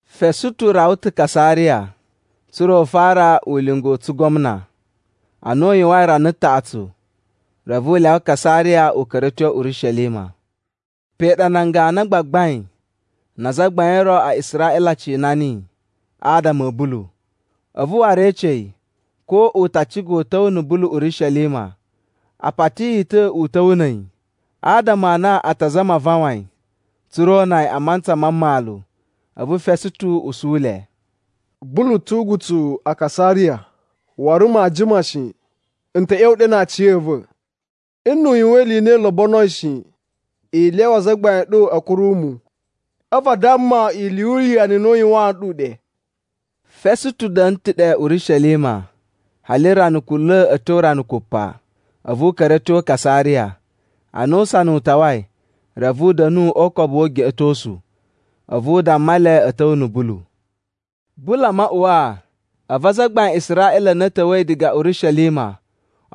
Fesutu rawa ta̱ Kasariya, tsa̱ra̱ u fara ulinga u tsugwamna. Ana u yuwain rana taꞌatsu, reve u lyawa Kasariya u ka̱ra̱ a̱ tyo Urishelima. Pe ɗa nan ganu a gbagbain na azagbain o ro a Israꞌila a cina niyi adama a̱ Bulu. A̱vu waru e ece yi ko u ta ciga u ta̱wa̱ na̱ Bulu Urishelima. A pati yi ta̱ u ta̱wa̱ na̱ a̱yi, adama a na a ta azama a vawan yi, tsa̱ra̱ o una yi a mantsa ma mmalu. A̱vu Fesutu usu le, “Bulu tu ugutsuwu a Kasariya, waru maa jima shi, n ta̱ ꞌya̱wa̱ ɗe na aciya̱va̱. Nnu u yuwan ili i na i lobonoi shi, i lyawa azagbain a̱ ɗu a̱ kuru mu, a̱vu a damma ili yu uwuyanu i na u yuwaan nɗu ɗe.” Fesutu da̱na̱ ta̱ ɗe Urishelima hali rana kunla̱ a̱ tyo rana kupa, a̱vu u ka̱ra̱ a̱ tyo Kasariya. Ana usana u tawai, reve u da̱nu o ukobu wu ugeꞌetosu, a̱vu u damma le a̱ ta̱wa̱ na̱ Bulu. Bulu a maꞌuwaa, a̱vu azagbain a Israꞌila a na a̱ ta̱wa̱i diga Urishelima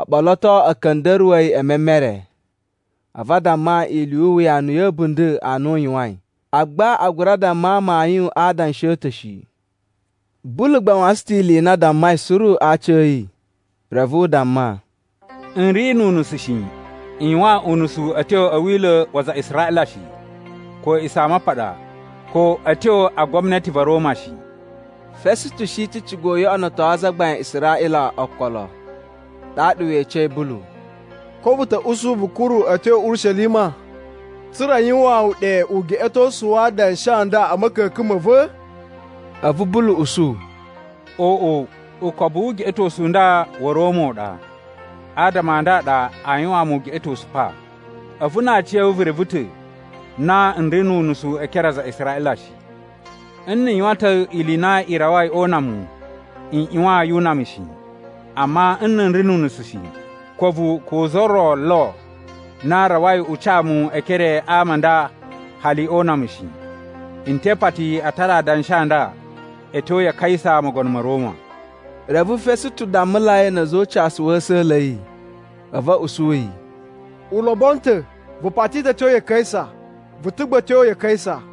o ɓoloto a̱ ka̱nda̱ruwa̱ yi e memere. A̱vu a damma ili yu uwuyanu ya̱ a̱bunda̱ a na u yuwain, agba a gura damma amayun a adanshi a̱ ta̱ shi. Bulu gba u wasan ta̱ ili i na a dammai suru a aciya̱yi, reve u damma, “N ri nu unusu shi. N yuwan unusu a̱ tyo a̱ Wila̱ wa aza a Israꞌila shi, ko a̱ A̱a̱ꞌisamapaɗa, ko a̱ tyo a gwamnati va̱ Roma shi.” Fesutu shi ta̱ ciga u yoꞌonoto azagbain a Israꞌila okolo. Ɗaɗa we ecei Bulu, “Ko vu ta̱ usu vu ka̱ra̱ a̱ tyo Urishelima, tsa̱ra̱ a yuwaan wu ɗe ugeꞌetosu wa adanshi a nda a̱ ma̱ka̱ka̱n ma̱ va̱?” A̱vu Bulu usu, “Oꞌo! Ukobu wu ugeꞌetosu u nda wa̱ Roma u ɗa, adama a nda a ɗa aa yuwaan mu ugeꞌetosu pa. A̱vu na aciya̱wu vu reve ta̱ na n ri nu unusu e ekere a aza a Israꞌila shi. Nna̱ n yuwan ta̱ ili i na i rawai o una mu, n ꞌyuwan yu una mu shi. Amma nna̱ n ri nu unusu shi, ko a̱vu ko za ro lo na rawai u ca mu e ekere a ama a nda hali o una mu shi. N te ipati a tara adanshi a nda a̱ tyo ya Kaisa mogono ma̱ Roma.” Reve Fesutu dammulai na̱ a̱za̱ o ucasu wa̱ a̱sa̱la̱ a̱ yi, a̱vu u usu yi, “U lobono ta̱! Vu pati ta̱ a̱ tyo ya Kaisa, vu ta̱ gba a̱ tyo ya Kaisa!”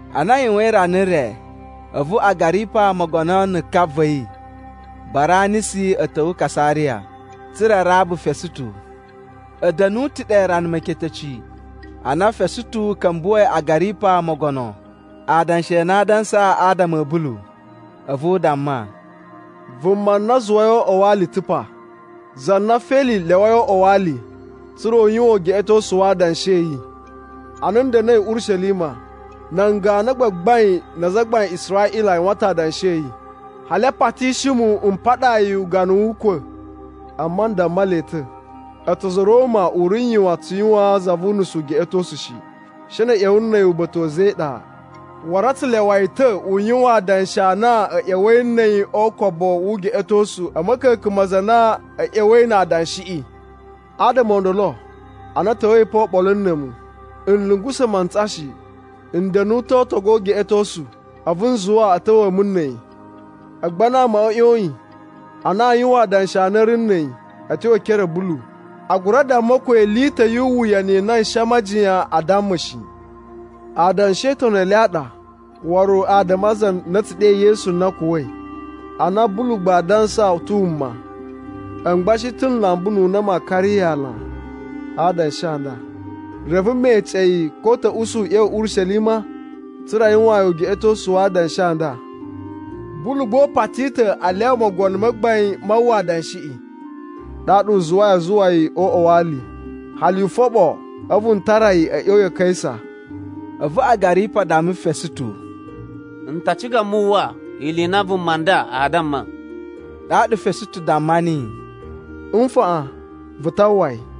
Ana a yuwain rana re, a̱vu Agaripa mogono na̱ ka va̱ yi Baranisi a̱ ta̱wa̱ Kasariya, tsa̱ra̱ a raba Fesutu. A̱ da̱nu ta̱ ɗe rana meketeci, ana Fesutu ka̱mbuwa̱i Agaripa mogono adanshi a na a dansa adama a̱ Bulu. A̱vu u damma, “Vuma na a zuwai o uꞌwa wa ali ta̱ pa, za na Feli lyawai o uꞌwa wa ali, tsa̱ra̱ n yuwan ugeꞌetosu wa adanshi a̱ yi. Ana n da̱na̱i Urishelima, nan ganu a gbagbain na azagbain a Israꞌila a yuwusan ta̱ adanshi a̱ yi, hali a patishi mu m paɗaa yi ugana wu ukwa̱. “Amma n damma le ta̱, a̱tsu a̱za̱ a̱ Roma u ri n yuwan tsu yuwaan za vu unusu ugeꞌetosu shi, she na̱ a̱ ꞌya̱wa̱ na̱ a̱yi uba̱ta̱ a̱za̱ e iɗa. Waru a tsu lyawa yi ta̱ u yuwan adanshi a na a̱ ꞌya̱wa̱i na̱ a̱yi o ukobu wu ugeꞌetosu a̱ ma̱ka̱ka̱n ma aza a na a̱ ꞌya̱wa̱i na adanshiꞌi. Adama o ndolo, ana a̱ ta̱wa̱i pa oɓolo na̱ a̱mu, n lungusa̱ mantsa shi, n da̱nu ta̱ o ootogu o ugeꞌetosu, a̱vu n zuwa a̱ ta̱wa̱a̱ mu na̱ a̱yi. Agba ana amaꞌa a̱ ꞌyoyin a na aa yuwan adanshi a na a̱ ri na̱ a̱yi a̱ tyo e ekere a̱ Bulu, a gura damma ko ili i ta̱ yu uwuyanu i na n shi aa majiyan a damma shi. Adanshi e Itoni i le a ɗa, waru adama a za na a̱ tsu ɗe Yesu na kuwa̱i a na Bulu gba a dansa u ta̱ wuma. A̱mu gba n shi ta̱ n lamba ununa ma kari yi ana a adanshi a nda. Reve me ece yi ko u ta̱ usu u ꞌya̱wa̱ Urishelima tsa̱ra̱ a yuwaan yi ugeꞌetosu wa adanshi a nda. Bulu gba u pati ta̱ a lyawa mogono ma gbain ma uwwa adanshiꞌi. Ɗaɗa n zuwai a zuwa yi o uꞌwa wa ali hali n foɓo, a̱vu n tara yi a̱ ꞌya̱wa̱ ya Kaisa.” A̱vu Agaripa damma Fesutu, “N ta ciga mu uwwa ili i na vuma nda aa damma.” Ɗaɗa Fesutu damma niyi, “Nfaꞌan, vu ta uwwa yi.”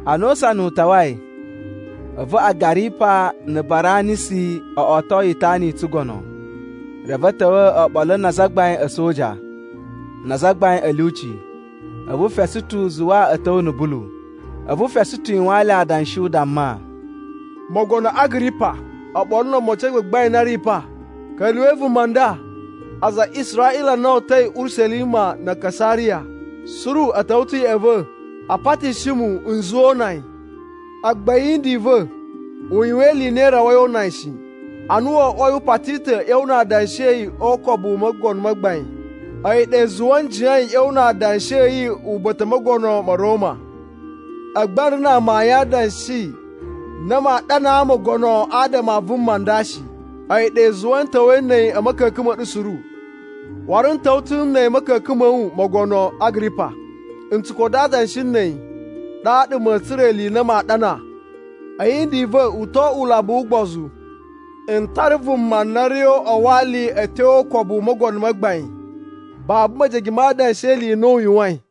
Ana usana u tawai, a̱vu Agaripa na̱ Baranisi o oto itana i tsugono reve a̱ ta̱wa̱ oɓolo na azagbain a̱ a̱soja na azagbain a̱ lyuci. A̱vu Fesutu zuwa a̱ ta̱wa̱ na̱ Bulu. A̱vu Fesutu yuwaan le adanshi u damma, “Mogono Agaripa oɓolo no omocin a gbagbain a na a̱ ri pa, ka̱lyuwa̱i vuma nda! Aza a Israꞌila a na o uta̱i Urishelima na̱ Kasariya suru a̱ ta̱wa̱ ta̱ ya̱ꞌa̱ va̱ a patishi mu n zuwa o una yi. Agba a̱ yindi i va̱, u yuwan ili i na i rawai o una yi shi. Ana wo oꞌwoi u pati ta̱ a̱ ꞌya̱wa̱ na adanshi a̱ yi o ukobu u mogono ma gbain, a̱yi ɗa i zuwai n jiyain n ꞌya̱wa̱ na adanshi a̱ yi uba̱ta̱ u mogono ma̱ Roma. Agba n ri na amayun a adanshi na maa ɗanaa mogono adama a vuma a nda shi. A̱yi ɗa i zuwai n ta̱wa̱i na̱ a̱yi a̱ ma̱ka̱ka̱n ma̱ ɗu suru. Waru n ta̱wa̱ ta̱ na̱ a̱yi a̱ ma̱ka̱ka̱n ma̱ wu, mogono Agaripa. Na̱ tsu koto adanshi a̱ yi, ɗaɗa ma̱a̱ tsura̱ ili i na maa ɗana. A̱ yindi i va̱ u to oꞌwo ulambu wu ugbozu n tara vuma na ri o uꞌwa wa ali a̱ tyo o ukobu u mogono ma gbain babu mejege ma adanshi e ili i na u yuwain!”